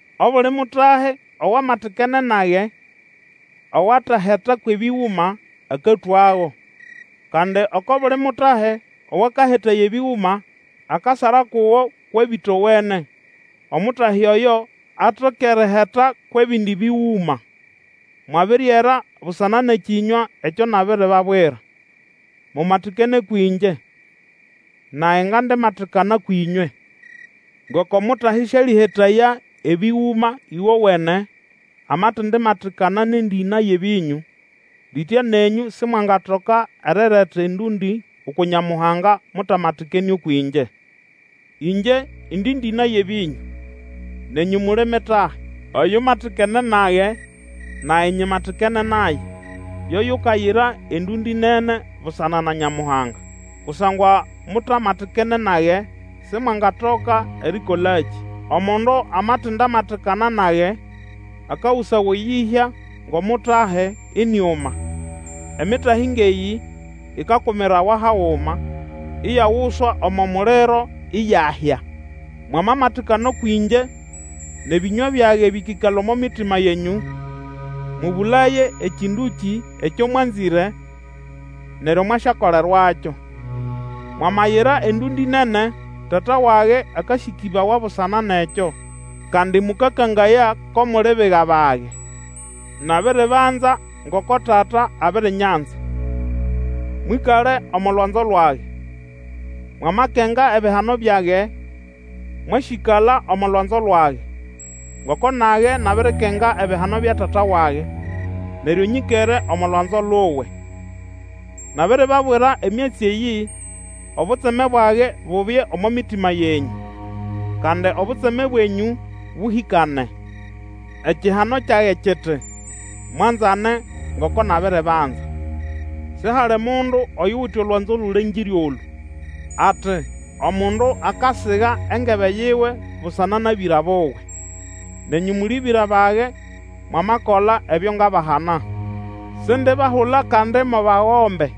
Obuli mutahi owamatikene nage, owateheta kwʼebĩgũma, akatwago; kandi oko buli mutahi Owakahetaya ebĩgũma, akasara kugo kwʼebĩtawene, Omutahi oyo atoke eriheta kwʼebindi bĩgũma. Mwabiriera busana nʼekĩnywa ekyo nabiribabwira. Mumatikane kwĩngye, nage ngandimatikana kwĩnywe. Ngoko Omutahi sialĩhetaya ebĩgũma ĩgowene, amatendimatikana nʼendĩna yʼebĩnyũ, litya nenyũ Simwangatoka erireta endũndĩ uku Nyamuhanga mutamatikene ũkwʼĩngye. Ĩngye indi ndĩna yʼebĩnyũ, nenyũ muli mitahi. Oyumatikene nage, nage nyimatikene naye, yo yukayira endũndĩ nene busana na Nyamuhanga. Kusangwa mutamatikene nage Simwangatoka erikolakĩ. Omundu amatindamatikana nage, akagusawa eyĩhya ngʼomutahi, iniuma, Emitahi ngʼeyĩ ikakumirawa haguma, iyaguswa omo muliro iyahya. Mwamamatikana kwĩngye, nʼebĩnywa byage bĩkĩkala omo mitima yenyũ, mũbũlaye ekĩndũkĩ ekyo mwanzĩre, neryo mwasyakolerwakyo. Mwamayira endũndĩ nene, Tata wage akasĩkĩbawa busana nʼekyo, kandi mũkakangaya ko muli biga bage. Nabiribanza ngoko Tata abirinyanza. Mwĩkale omo lwanzo lwage. Mwamakenga ebihano byage, mwasyĩkala omo lwanzo lwage, ngoko nage nabirikenga ebihano bya Tata wage, neryo nyĩkere omo lwanzo luwe. Nabiribabwira emyatsi eyĩ, obutseme bwage bubye omo mitima yenyũ, kandi obutseme bwenyũ bũhĩkane. Ekihano kyage kiti: mwanzane, ngoko nabiribanza. Sihali mundu oyuwite olwanzo lũlengĩre olũ, ati omundu akasiga engebe yiwe busana nʼabĩra buwe. Nenyũ muli bĩra bage, mwamakola ebyo ngabahana. Sindibahula kandi mo bagombe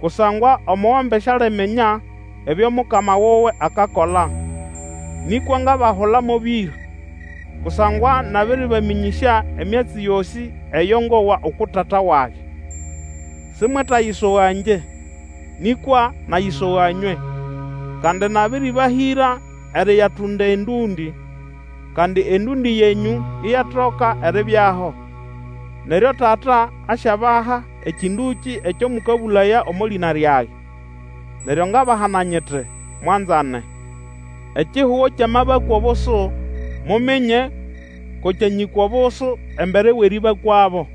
kusangwa omugombe sialiminya ebyo mukama wuwe akakola. Nĩkwa ngabahula mo bĩra, kusangwa nabĩrĩbamĩnyĩsya emyatsi yosĩ eyo ngowa uku Tata wage. Simwetayisoga ngye, nĩkwa nayisoga nywe, kandi nabĩrĩbahĩra eriyatunda endũndĩ, kandi endũndĩ yenyũ iyatoka eribyaho. Neryo Tata asyabaha ekĩndũkĩ ekyo mũkabũlaya omo lĩna lyage. Neryo ngabahana nyiti, Mwanzane. Ekihugo kyamabakwa obusu, muminye ko kyanyĩkwa obusu embere wʼerĩbakwabo.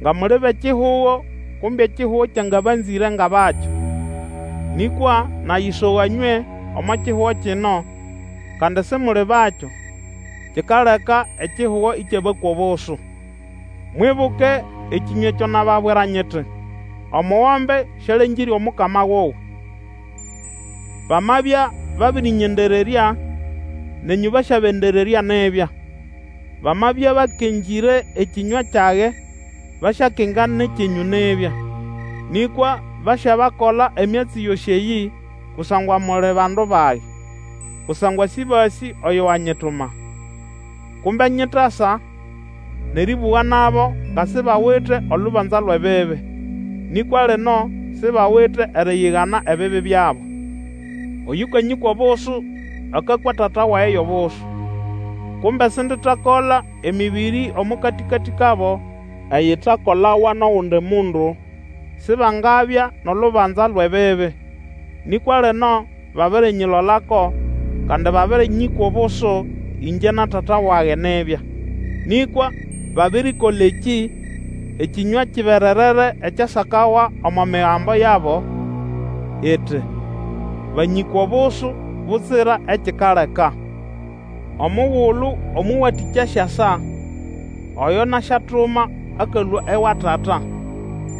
Nga muli bʼekihugo, kumbe ekihugo kyangabanzĩre ngʼabakyo. Nĩkwa nayisoga nywe omo kihugo kino, kandi Simuli bakyo; kikaleka ekihugo ĩkyabakwa obusu. Mwibuke ekĩnywa ekyo nababwira nyiti, Omugombe sialengĩre omukama wuwe. Bamabya babĩrĩnyendererya, nenyũ basyabendererya nibya; bamabya bakengĩre ekĩnywa kyage, basyakenga nʼekyenyũ nibya. Nĩkwa basyabakola emyatsi yosĩ eyĩ kusangwa muli bandu bage, kusangwa sĩbasĩ oyo wanyituma. Kumbe nyitasa nʼerĩbũga nabo, nga sibawite olubanza lwʼebibi, nĩkwa lino sibawite eriyigana ebibi byabo. Oyũkanyĩkwa obusu, akakwa Tata wage yʼobusu. Kumbe sinditakola emĩbĩrĩ omo katĩkatĩ kabo eyitakolawa nʼogundi mundu, Sibangabya nʼolubanza lwʼebibi; nĩkwa lino babirinyilolako, kandi babĩrĩnyĩkwa obusu, ĩngye na Tata wage nibya. Nĩkwa babirikola ekĩ, ekĩnywa kibererere ekyasakawa omo Migambo yabo, iti, Banyĩkwa obusu butsira ekikaleka. Omugulu Omũwatĩkya asyasa, oyo nasyatuma akalũa ewa Tata,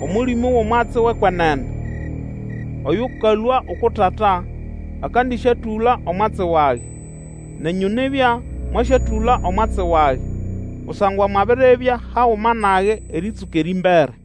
Omũlĩmũ wʼomwatsi wʼekwenene, oyũkalũa uku Tata, akandĩsyatũla omwatsi wage. Nenyũ nibya, mwasyatũla omwatsi wage, kusangwa mwabiribya haguma nage erĩtsũka erĩmbere.